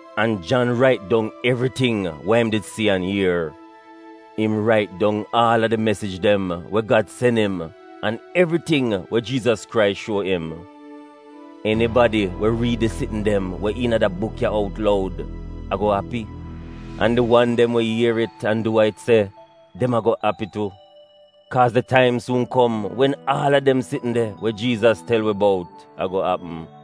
An Jan rait dong evriting wa im did si an ier. Im rait dong aal a di mesij dem we Gad sen im, an evriting we Jiizas Krais shuo im. Enibadi we riid di sitn dem we iina da buk ya out loud ago api, an di wan dem we ier it an du wa it se, dem ago api tu. Kaaz di taim suun kom wen aal a dem sitn dem we Jiizas tel wi bout ago apm.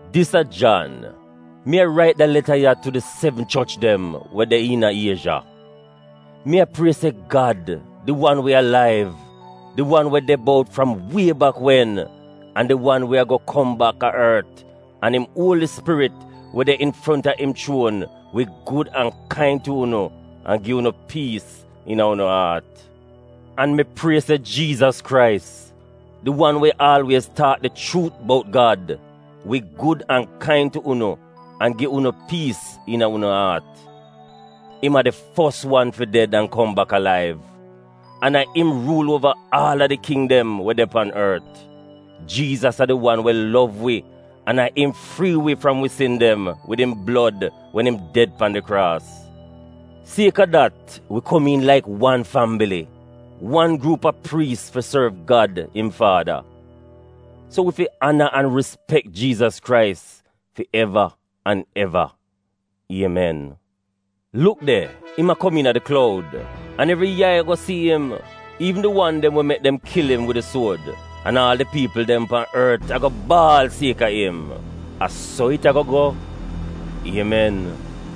Dis a Jan. Mi a rait da leta ya tu di sevn choch dem we de iina Iezha. Mi a prie se Gad, di wan we alaiv, di wan we de bout fram wie bak wen, an di wan we ago kom bak a ort, an im Uoli Spirit we de infronta im chuon, wi gud an kain tu unu an gi unu piis iina unu aat. An mi prie se Jiizas Krais, di wan we aalwiez taak di chuut bout Gad, wi gud an kain tu unu an gi unu piis iina unu aat. Im a di fos wan fi ded an kom bak alaiv, an a im ruul uova aal a di king dem we de pan ort. Jiizas a di wan we lov wi an a im frii wi fram wi sin dem wid im blod wen im ded pan di kraas. Sieka dat wi komiin laik wan fambili, wan gruup a priis fi sorv Gad im Faada. So wi fi ana an rispek Jiizas Krais fi eva an eva! Iemen! Luk de! Im a kom iina di kloud, an evri yai ago si im, iivn di wan dem we mek dem kil im wid di suod; an aal di piipl dem pan ort ago baal sieka im. A so it ago go! Iemen.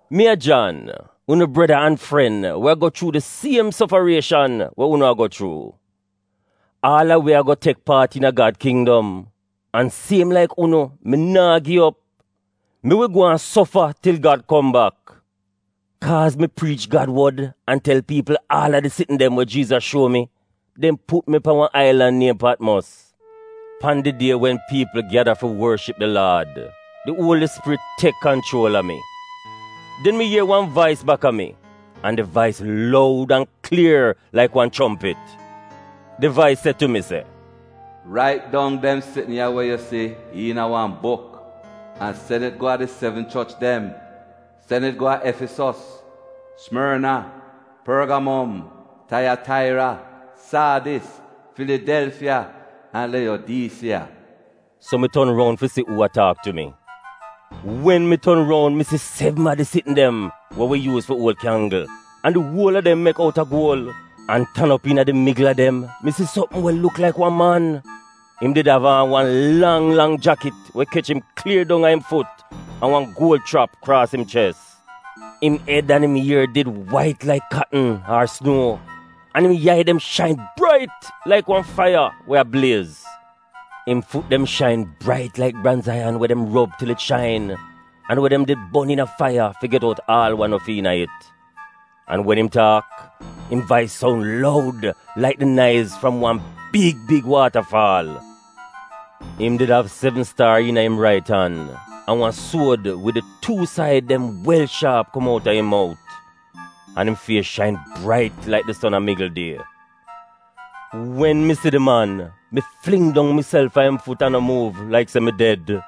Mi a Jan, unu breda an fren we a go chuu di siem sofarieshan we unu a go chuu. Aal a wi ago tek paat iina Gad kindom, an siem laik unu, mi naa gi op — mi wi gwaan sofa til Gad kom bak. Kaaz mi priich Gad wod an tel piipl aal a di sitn dem we Jiizas shuo mi, dem put mi pan wan ailan niem Patmos. Pan di die wen piipl gyada fi worship di Laad, di Uoli Spirit tek kanchuol a mi. Den mi ier wan vais baka mi, an di vais loud an klier laik wan chompit. Di vais se tu mi se, “Rait dong dem sitn ya we yu si iina wan buk an sen it go a di sevn choch dem: sen it go a Efisos, Simorna, Porgamom, Taiyataira, Saadis, Filidelfiya an Leyodiisiya. So mi ton roun fi si uu a taak tu mi. Wen mi ton roun mi si sevn a di sitn dem we wi yuuz fi uol kyanggl, an di uol a dem mek outa guol. An tan op iina di migl a dem, mi si sopm we luk laik wan man. Im did av aan wan lang lang jakit we kech im klier dong a im fut, an wan guol schrap kraas im ches. Im ed an im ier did wait laik katn ar sunuo, an im yai dem shain brait laik wan faiya we a bliez. Im fut dem shain brait laik branz aiyan we dem rob til it shain, an we dem did bon iina faiya fi get out aal wa no fi iina it. An wen im taak, im vais soun loud laik di naiz fram wan big big waatafaal. Im did av sevn staar iina im rait an, an wan suod wid di tuu said dem wel shaap kom outa im mout. An im fies shain brait laik di son a migl die. Wen mi si di man, mi fling dong miself a im fut an no muuv — laik se mi ded.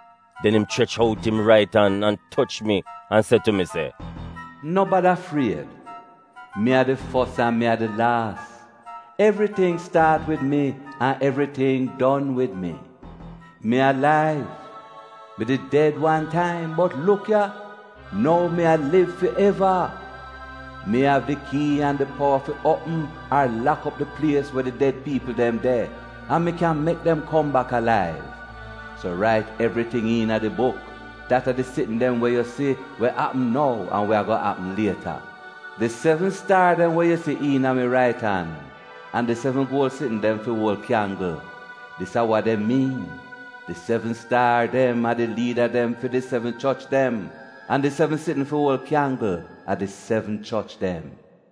Den im chrech out im rait an, an toch mi an se tu mi se, “No bada fried. Mi a di fos an mi a di laas. Evriting staat wid mi, an evriting en wid mi. Mi alaiv! Mi did ded wan taim, bot luk, nou mi a liv fi eva! Mi av di kii an di powa fi uopm ar lak op di plies we di ded piipl dem de, an mi kyan mek dem kom bak alaiv. “So rait evriting iina di buk, dat a di sitn dem we yu si we a apm nou an we go apm lieta. Di sevn staar dem we yu si iina mi rait an, an di sevn guol sitn dem fi uol kyanggl, dis a wa dem miin: di sevn staar dem a di liida fi di sevn choch dem, an di sevn sitn fi uol kyanggl a di sevn choch dem.”